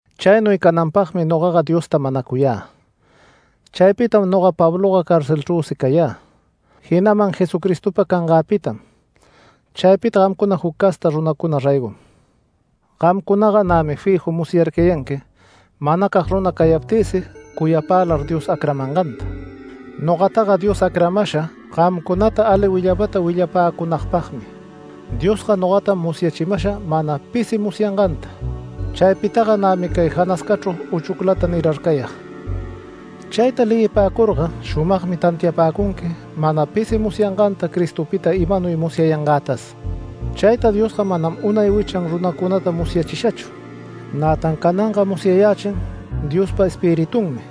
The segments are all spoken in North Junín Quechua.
Chaynuy cananpagmi nogaga Diosta manacuyä. Chaypitam noga Pabloga carcelchrüsi cayä, jinaman Jesucristopa cangäpitam chaypita gamcuna juc casta runacuna raygom. Gamcunaga nämi fiju musyarcayanqui manacag runa cayaptïsi cuyapälar Dios acramanganta. Nogataga Dios acramasha gamcunata ali willapata willapäcunagpagmi. Diosga nogatam musyachimasha mana pisi musyanganta. Chaypitaga nämi cay janascachru uchuclata nirarcayag. Chayta leyipäcurga shumagmi tantiapäcunqui mana pisi musyanganta Cristopita imanuy musyayangätas. Chayta Diosga manam unay wichan runacunata musyachishachu. Nätan cananga musyayächin Diospa Espiritunmi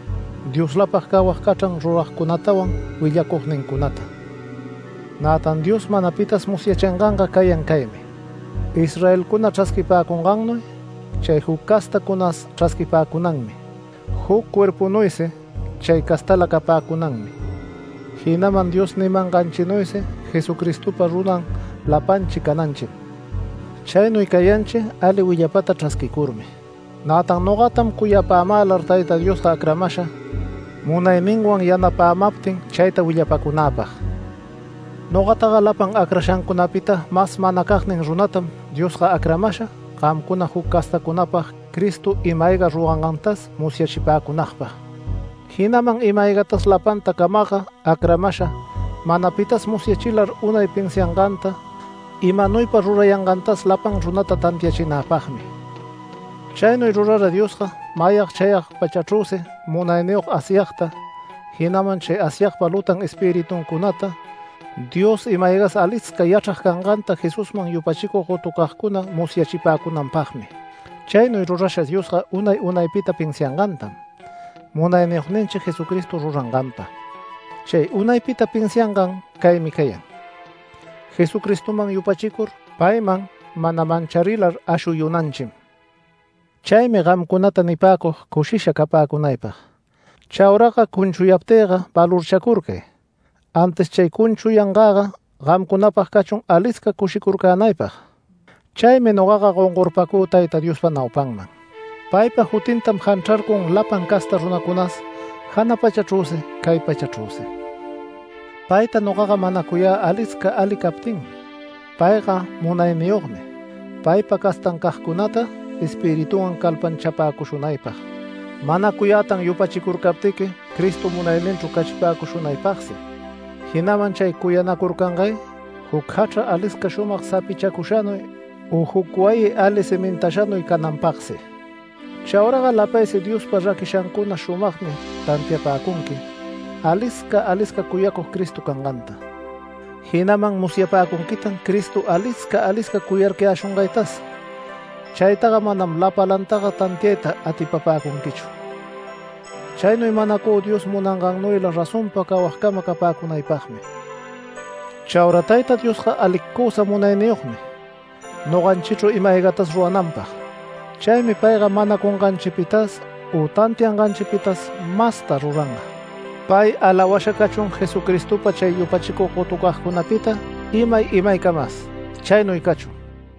Dioslapag cawag cachran ruragcunatawan willacugnincunata. Nätan Dios mana pitas musyachinganga cayan caymi: Israelcuna chrasquipäcungannuy chay juc castacunas chrasquipäcunanmi, juc cuerpunuysi chay castala capäcunanmi, jinaman Dios nimanganchinuysi Jesucristopa runan lapanchi cananchim. Chaynuy cayanchi ali willapata chrasquicurmi. Nätan nogatam cuyapämälar Tayta Diosga acramasha, munayninwan yanapämaptin chayta willapäcunäpag. Nogataga lapan acrashancunapita mas manacagnin runatam Diosga acramasha, gamcuna juc castacunapag Cristo ima-ayga rurangantas musyachipäcunagpag. Jinaman ima-aygatas lapanta camagga acramasha, mana pitas musyachilar unay pinsianganta imanuypa rurayangantas lapan runata tantiachinäpagmi. Chaynuy rurara Diosga mayag chayag pachachrüsi munayniyog Asyagta, jinaman chay Asyagpa lutan espirituncunata Dios ima-aygas alisca yachrag canganta Jesusman yupachicug gotucagcuna musyachipäcunanpagmi. Chaynuy rurasha Diosga unay unaypita pinsiangantam, Munayniyogninchi Jesucristo ruranganpa. Chay unaypita pinsiangan caymi cayan: Jesucristoman yupachicur payman mana mancharilar ashuyunanchim. Chaymi gamcunata nipäcug cushisha capäcunaypag. Chauraga cunchuyaptïga valorchacurcay, antis chay cunchuyangäga gamcunapag cachun alisca cushicurcänaypag. Chaymi nogaga gongorpacü Tayta Diospa naupanman. Paypa jutintam janchrarcun lapan casta runacunas, jana pachachrüsi, cay pachachrüsi. Payta nogaga manacuyä alisca ali captinmi. Payga munayniyogmi paypa castancagcunata Espiritunwan calpanchapäcushunaypag. Manacuyätan yupachicurcaptiqui Cristo munayninchru cachipäcushunaypagsi, jinaman chay cuyanacurcangay juc jachra alisca shumag sapichacushanuy, u juc wayi ali cimintashanuy cananpagsi. Chauraga lapaysi Diospa raquishancuna shumagmi tantiapäcunqui, alisca alisca cuyacug Cristo canganta. Jinaman musyapäcunquitan Cristo alisca alisca cuyarcayäshungaytas. Chaytaga manam lapalantaga tantiayta atipapäcunquichu. Chaynuy manacü Dios munangannuyla razonpa cawagcama capäcunaypagmi. Chaura Tayta Diosga alicusa munayniyogmi noganchichru ima-aygatas rurananpag. Chaymi payga manacunganchipitas u tantianganchipitas masta ruranga. Pay alawasha cachun Jesucristopa chay yupachicug gotucagcunapita imay imaycamas. Chaynuy cachun.